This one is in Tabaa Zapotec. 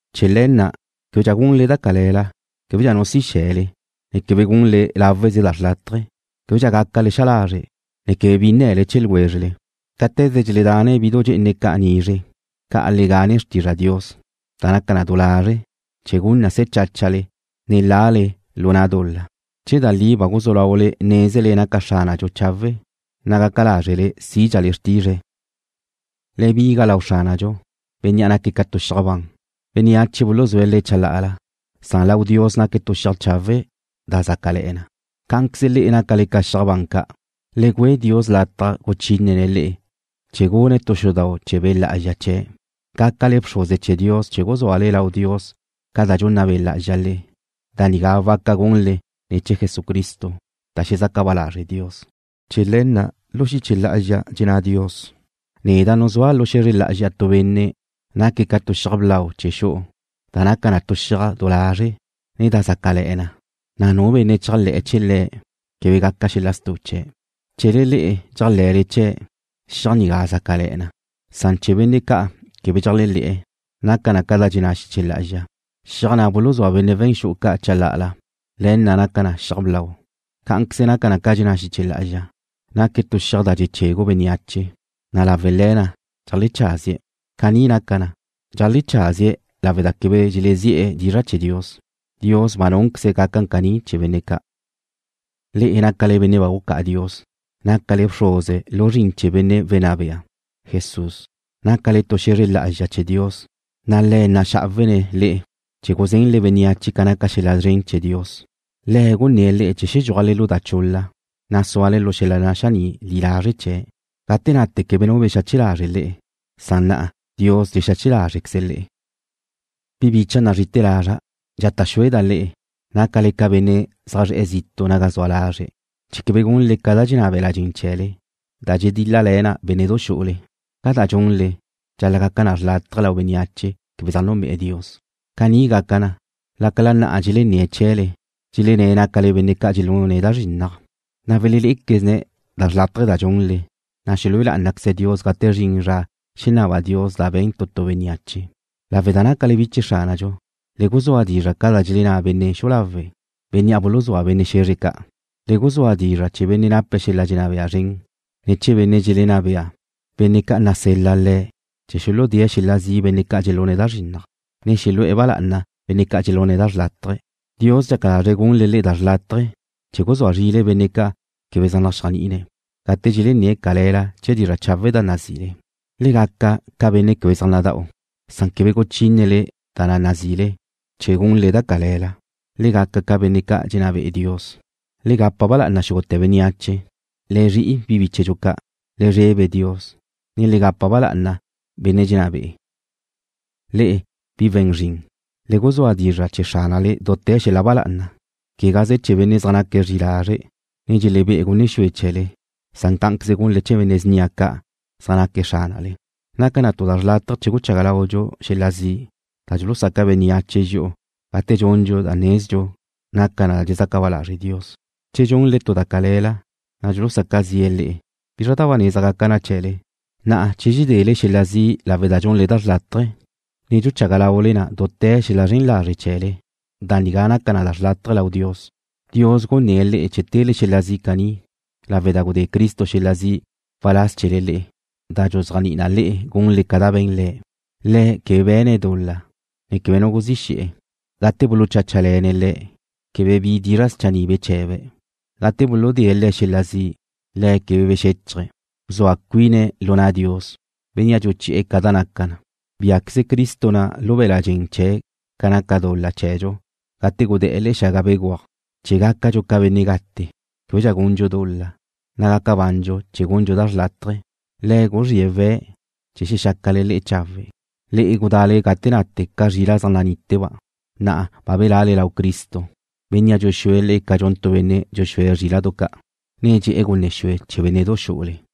Chee̱ le̱ na', québedxa gunle da cale̱la. Québedxa nu si xe̱le, ne quebe gunle láweze da xrlátaje. Québedxa gácale xa lazre', ne quebe bi nne̱le chee̱ ljwézrele. Cáte̱ze dxeledane bidu dxe'ene ca' nizre', ca' le gane xrtizra Dios, da naca na du lazre', chee̱ gun na se̱ cháchale, ne lale lu na' dul-la. Che da li ba guzú laule nézele naca Xránadxu chawe', na' gaca lázrele sídxale xrtizre̱'. Le biga lau Xránadxu, Bénnea' naque̱' ca xiaj xre ban. Bénneache buluzúe̱' Le̱' chalá'ala, san lau Dios naque̱' tu xiaj chawe' da zácale̱'e̱ na. Cá'anqueze le'e nácale ca xiaj ban ca'. Le güe Dios lataj guchínene̱' le'e chee̱ gune̱' tu xudau' chee̱ Be' Lá'azxa chee̱', gácale bxruze chee̱ Dios chee̱ guzúale lau Dios ca da dxunna Be' Lá'azxa le'e. Da nigá waca gunle ne̱ chee̱ Jesucristo, da xezaca ba lazre' Dios. Chee̱ le̱ na' lu xiche lá'azxa dxenná Dios: Neda' nuzúa' lu xe̱zre lá'azxa tu benne' naque̱' ca tu xiaj blau chee̱ xu'u, da naca na tu xiaj du lazre', ne da zácale̱'e̱ na, na' nu benne' chéajle̱'e̱ chee̱ Le̱' quebe gaca xel-la' stu chee̱'. Chee̱le le'e dxéajle̱le chee̱', xiaj nigá zácale̱'e̱ na, san chee̱ benne' ca' quebe dxéajle̱'e̱ naca na ca da dxenná xiche lá'azxa: Xiaj na' buluzúa benne' we̱n xu'u ca' chalá'ala, le̱ na' naca na xiaj blau. Cá'anqueze naca na ca dxenná xiche lá'azxa: Naque̱' tu xiaj da dxechegu bénneache, na' lawe' le̱ na' dxeajlecházie̱'. Caní naca na, dxeajlecházie̱' lawe' da quebe dxelezi'e̱ dizra' chee̱ Dios. Dios ba núnqueze̱' gaca caní chee̱ benne' ca'. Le'e nácale benne' ba gucá'a Dios. Nácale bxuze lu zrin chee̱ Benne' Wenná Bea, Jesús. Nácale tu xe̱zre lá'azxa chee̱ Dios, na' Le̱' naxá'awene̱' le'e chee̱ guzenle bénneache ca naca xel-la' szren chee̱ Dios. Le̱' gunné̱' le'e chee̱ xedxúajle lu da chul-la, na' súale lu xel-la' naxaní' li lazre' chee̱'. Gate nate quebe nu bexache lazre' le'e, san na'a Diósqueze̱' dxexache lazre̱' le'e. Bi bicha' nazri'ite̱ lazra', dxata' xueda' le'e, nácale ca benne' zaj zre̱'e̱ zitu' naga zua lazre̱', chee̱ quebe gunle ca da dxenná be̱la' dxen chee̱le, da dxedíl-lale̱ na bénne'du xu'ule. Ca da dxunle, dxal-la' gaca na xrlátaje lau bénneache quebe zaj núnbe'e̱ Dios. Caní gaca na, lácala na'a dxelenné̱' chee̱le, dxelenné' nácale benne' ca' dxelune̱' da zrinnaj, na' welelé'equezne̱' da xrlátaje da dxunle, na' xelúe lá'anaqueze̱' Dios gate zrin zra xenaba Dios da be̱n tu tu bénneache. Lawe' da nácale bi chee̱ Xránadxu, le guzúa dizra' ca da dxenná benne' xu'u lawe', bénnea' buluzúa benne' xe̱zre ca'. Le guzúa dizra' chee̱ benne' nape̱' xel-la' dxenná bea zren, ne chee̱ benne' dxelenná bea, benne' ca' nasel-la le̱' chee̱ xuludée̱' xel-la' zi' benne' ca' dxelune̱' da zrinnaj, ne xelu'e̱ ba lá'ana benne' ca' dxelune̱' da xrlátaje. Dios dxaca lazre̱' gunle le'e da xrlátaje chee̱ guzúa zrile benne' ca' quebe zaj naxéajni'ine̱', gate dxelenné̱' cale̱la chee̱ dizra' chawe' da nazile. Le gaca ca benne' quebe zaj nada'u, san quebe guchínele da na' nazile, quebe gunle da cale̱la. Le gaca ca benne' ca' dxenná be'e Dios. Le gapa ba lá'ana xúgute̱ bénneache. Le zri'i bi bíchedxu ca'. Le zrebe Dios, ne le gapa ba lá'ana benne' dxenná be'e̱. Le'e, bi we̱n zrin, le guzúa dizra' chee̱ xránale dute̱ xel-la' ba lá'ana, quegaze chee̱ benne' zaj naque̱' zri'i lazre', ne dxelebé'e̱ gunne xue chee̱le, san cá'anqueze gunle chee̱ benne' snia ca' zaj naque̱' xránale. Naca na tu da xrlátaje che guchaga laudxu xel-la' zi' da dxulusaca bénneache dxi'u gate dxundxu da nezdxu naca na da dxezaca ba lazre' Dios. Che dxunle tu da cale̱la, na' dxulusaca zi'e̱ le'e, ¿bizra da ba neza gaca na chee̱le? Na'a, che dxedele xel-la' zi' lawe' da dxunle da xrlátaje, ne dxuchaga laule na dute̱ xel-la' zren lazre' chee̱le, da nigá naca na xrlátaje lau Dios. Dios gunné' le'e chee̱ tele xel-la' zi' caní, lawe' da gudé Cristo xel-la' zi' waláz chee̱le le'e, da dxuzéajni'i na le'e gunle ca da be̱n Le̱'. Le̱' quebe be̱ne' dul-la, ne quebe nu guzí xe̱'e̱. Gate bulucháchale̱ne̱' Le̱', quebe bi dizra' schanni' beche̱be̱'. Gate buludée̱' Le̱' xel-la' zi', Le̱' quebe bexéchaje̱'. Bzua cuine̱' lu na' Dios, Bénnea' dxuchi'e̱ ca da naca na. Biá'queze Cristo na' lu be̱la' dxen chee̱' ca naca dul-la chee̱dxu gate gude̱'e̱ le̱'e̱ xaga begúaj, chee̱ gácadxu ca benne' gate, québedxa gundxu dul-la, na' gaca bandxu chee̱ gundxu da xrlátaje. Le̱' guzríe̱' we̱' chee̱ xexácale le'e chawe'. Le'e gudale gate nate ca zrila' zaj naníteba'. Na'a ba bela'le lau Cristo, Bénnea' dxuxúe̱' le'e ca dxun tu benne' dxuxúe̱' zríla'du ca', ne dxe'e̱ gunne xue chee̱ bénne'du xú'ule.